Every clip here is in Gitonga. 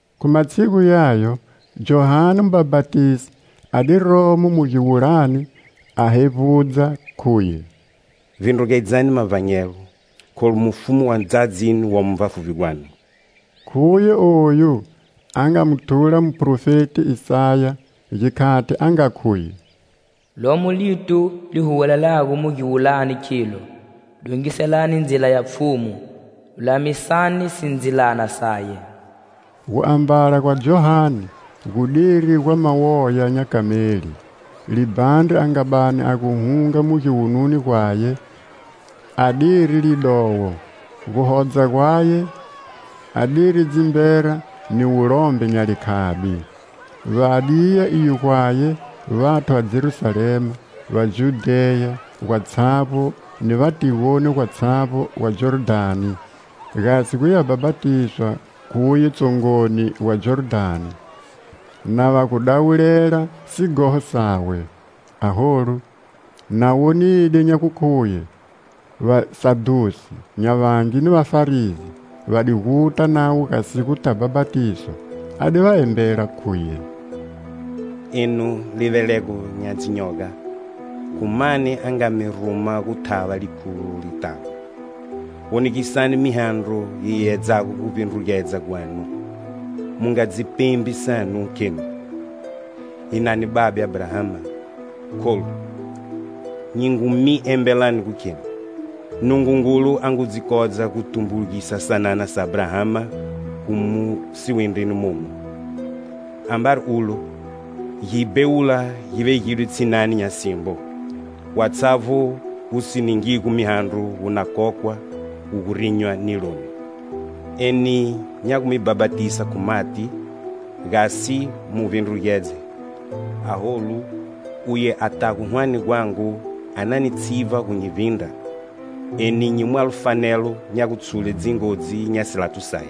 Khu matshigu yayo, Johane mubhapatisi a di romo mu giwulani a hevbudza, khuye: "Vbindrugedzani mavbanyelo, kholu Mufumu wa ndzadzini womo vbafuvbi gwanu." Khuye oyu a nga mu thula muphrofeti Isaya, gikhati a nga khuye: "Lomo lito li huwelelago mu giwulani, khilo:'Dongiselani ndzila ya Pfhumu,lulamisani sindzilana saye.' " Guambala gwa Johane gu diri gwa mawoya nya kameli; libhandri a nga bani a gu hunga mu giwununi gwaye a diri lidowo; guhodza gwaye a diri dzimbera ni wulombe nya likhabi. Va di ya iyo gwaye vathu va Jerusalema, va Judheya gwatshavbo ni va tigoni gwatshavbo ga Jordhani, gasi guya bhapatiswa khuye tsongoni wa Jordhani, na va gu dawulela sighoho sawe. Aholu, na wonide nya gukhuye Vasadhusi nya vangi ni Vafarisi va di guta navo gasi guta bhapatiswa, a di va embela, khuye: "Enu livelego nya dzinyoga! Khu mani a nga mi ruma gu thava likhulo litago? Wonegisani mihandro yi yeyedzago guvbindrugedza gwanu. Mu nga dzi pembi sanu, khenu: 'Hi na ni babe Abrahama!' Kholu, nyi ngu mi embelani gukheni, Nungungulu a ngu dzi kodza gu tumbulugisa sanana sa Abrahama khu mu siwindrini momu. Ambari ulo, gibhewula gi vegidwe tshinani nya simbo; watshavbo wu si ningigo mihandro wu na kokwa, wu gu rinywa niloni. Eni nya gu mi bhapatisa khu mati, gasi mu vbindrugedze; aholu uye a tago hwane gwangu a na ni tshivba gu nyi vbindra; eni nyi mwalo fanelo nya gutshule dzingodzi nya silato saye.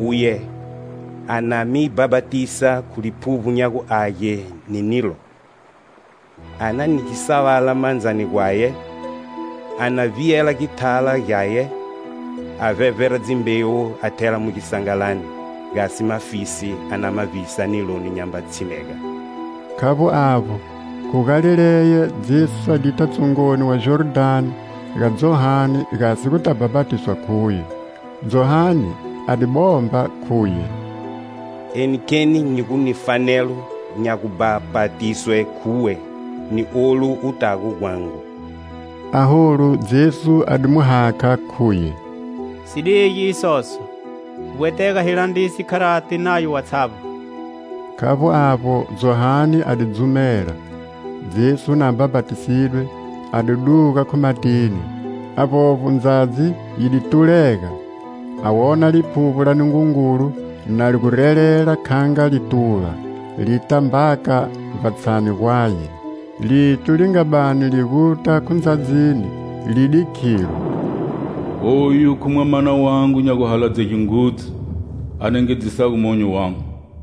Uye a na mi bhapatisa khu Liphuvbo nya gu Age ni nilo. A na ni gisalava mandzani gwaye; a na vbiyela githala gyaye, a vbevbera dzimbewu a thela mu gisangalani, gasi mafisi a na ma vbisa niloni nyamba tshimega." Khavbo avbo, khu Galileya Jesu a dita tsongoni wa Jordhani ga Johane gasi guta bhapatiswa khuye. Johane a di bomba, khuye: "Eni kheni nyi gu ni fanelo nya gubhapatiswe khuwe, ni olu u tago gwangu!" Aholu Jesu a di mu hakha, khuye: "Si dige isoso. Gu vbwetega hi landrise, kharati, nayo watshavbo." Khavbo avbo Johane a di dzumela. Jesu na bhapatisidwe, a di duga khu matini. Avbovbo ndzadzi yidi tulega, a wona Liphuvbo la Nungungulu na li gu relela kha nga lituva, li ta mbaka vbatshani gwaye. Lito li nga bani a li guta khu ndzadzini li di khilo: "Oyu khu Mwamana wangu nya guhaladzege ngudzu, a nengedzisago monyo wangu."